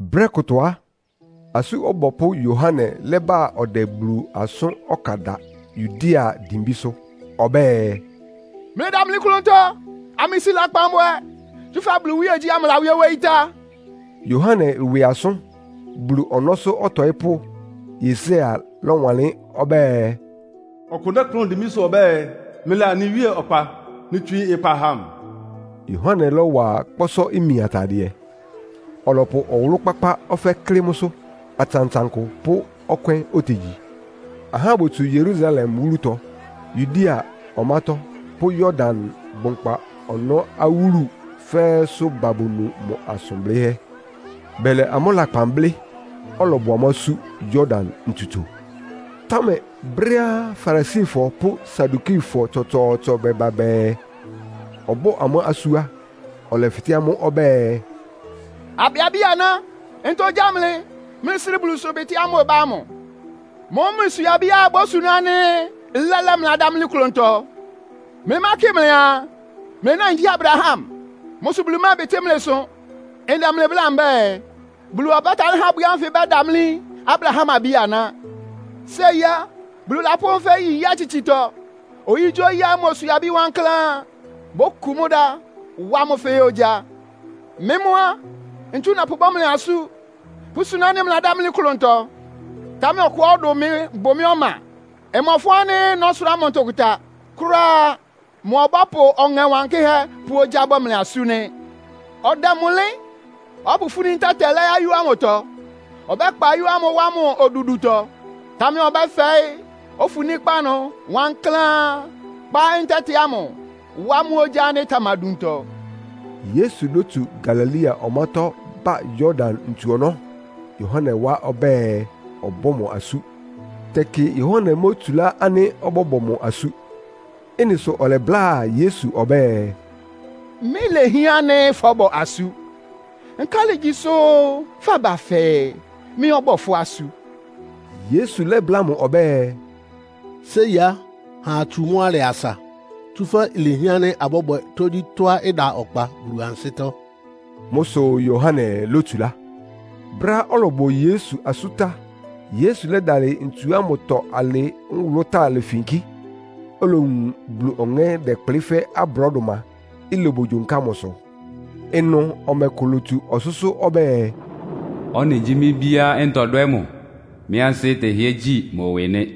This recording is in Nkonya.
Brɛ́ kʋtɔ á, Asú Ɔbɔpʋ́ Yohane lɛ́ba ɔdɛ Bulu asʋ́n ɔkan da Yudea dimbísʋ́. Ɔbɛ́ɛ, “Mlɩdamli klʋntɔ, amlɩsi lakpan bwɛ, tsúfɛ́ Bulu iwíegyí lawíé wóyí tá.” Yohane ɩwɩ asʋ́n Bulu ɔnɔ́sʋ́ ɔtɔɩ́pʋ́Yesaia lɔ́wanlɩ́n ɔbɛ́ɛ, “Ɔkʋ dɛ́kplʋn dimbísʋ́ ɔbɛ́ɛ, ‘Mlɩla anɩ Wíe ɔkpa. Mlɩtswii ɩkpa ha mʋ’” amʋ nɩ. Yohane lɔ́wa kpɔ́sɔ́-imi atadɩɛ, ɔlɔpʋ ɔwʋlʋ́-kpákpá ɔfɛ́ klɩ́ mʋ́sʋ́. Atsantsankʋ pʋ́ ɔkwɛ́n otegyi. Ahá botsu Yerusalem wúlutɔ, Yudea ɔmátɔ́ pʋ́ Yordan bʋnkpa ɔnɔ́ awúlu fɛ́ɛ́sʋ́ ba bonu mʋ asʋn blɩ́hɛ́. Bɛlɛ amʋ́ lakpan blɩ́, ɔlɔbɔ amʋ́ asú Yordan ntsutso. Támɛ brɛ́á Farisifɔ pʋ́ Sadukifɔ tsɔtsɔɔtsɔ bɛba bɛɛ, ɔbɔ́ɔ amʋ́ asú á, ɔlɛfɩtɛ́ amʋ́ ɔbɛ́ɛ, “Abɛ abí-aná, ntɔ gyá mlɩ, mlɩsrɩ́ Bulu ɩsʋbɩtɩ́ ámʋ́ʋ́ ɩbá ámʋ? Mʋ́mʋ́ mlɩswie abíá ibósuná ánɩ́ lɛ́lɛ́ mlɩladámlí klʋntɔ. Mlɩmákɩ mlɩaa, mlɩ náin gyí Abraham. Mʋ́ sʋ Bulu mɛ́ɛbɩtɩ́ mlɩ ɩsʋ. Ndɛ mlɩ bláa mbɛ́ɛ, Bulu ɔbɛ́talɩ́ há abwi ánfɩ ɩbɛ́damlí Abraham abí-aná. Séi á, Bulu lapʋ́ ɛfɛ́ yi nyí-atsitsitɔ. Oyígyíoyí ánɩ́ imoswie abi wankláán á, bókun mʋ́ dá, wá mʋ́ fɛ́ɛ́ ogyá. Mɩ́ mʋ́ á, ntsu ndɛpʋbɔ́ mlɩ asú pʋ́súná ánɩ́ mlɩladámlí klʋntɔ. Támɛ ɔkʋá ɔdʋn mɩ bʋ ɔma ɔbá. Mmɔfʋn ánɩ́ nɔ́sʋrá mʋ ntʋkʋta kʋ́ráá. Mʋ ɔbɔ́pʋ Ɔŋɛ Wankɩ́hɛ́ pʋ́ ogyá bɔ́ mlɩ asú nɩ́. Ɔdɛ mʋ ɩlɩ́n, ɔbɔ́pʋfúní ntɛ́tɛ lɛ́ ayó ámʋtɔ. Ɔbɛ́kpa ayó ámʋ wá mʋ odudutɔ. Támɛ ɔbɛ́fɛɩ́ ofuníkpá ɩnʋ wankláán, kpá ntɛ́tɛ amʋ wá ogyá ánɩ́ ɩtamaduntɔ.” Yesu lótsu Galilea ɔmátɔ́ ba Yordan ntsu ɔnɔ́ Yohane wá ɔbɛ́ɛ, ɔbɔ́ mʋ asú. Tɛkɩ Yohane mótsulá ánɩ́ ɔbɔ́bɔ mʋ asú. Ɩ́nɩ sʋ ɔlɛbláa Yesu ɔbɛ́ɛ, “Mɩ́ ilehián ánɩ́ fɔ́bɔ asú. Nkálɩ ígyi sʋ́ faba fɛɛ mɩ́ ɔbɔ́ɔ fʋ́ asú?” Yesu lɛ́bláa mʋ ɔbɛ́ɛ, “Séi á, ha atsu mʋ́ alɩ asa, tsúfɛ́ ilehián ánɩ́ abɔ́bwɛ tógyítɔ́á ɩda ɔkpa Bulu ansɩ́tɔ́.” Mʋ́ sʋ Yohane lótsulá. Brɛ́á ɔlɔbɔ Yesu asú tá, Yesu lɛ́dalɩ ntsu ámʋtɔ alɩ nwʋlʋ́táa lefinkí, olowun Bulu Ɔŋɛ́ dɛkplɩ́ fɛ́ abrɔ́dʋma, ilobogyonká mʋsʋ. Ɩnʋ ɔmɛ kʋ lotsu ɔsʋ́sʋ́ ɔbɛ́ɛ, “Ɔ́nɩ gyí mɩ́ Bíá ntɔdwɛ́ mʋ, mɩ ansɩ́ tɛhɩ́ɛ́ gyi mʋ ɩwɩ nɩ́.”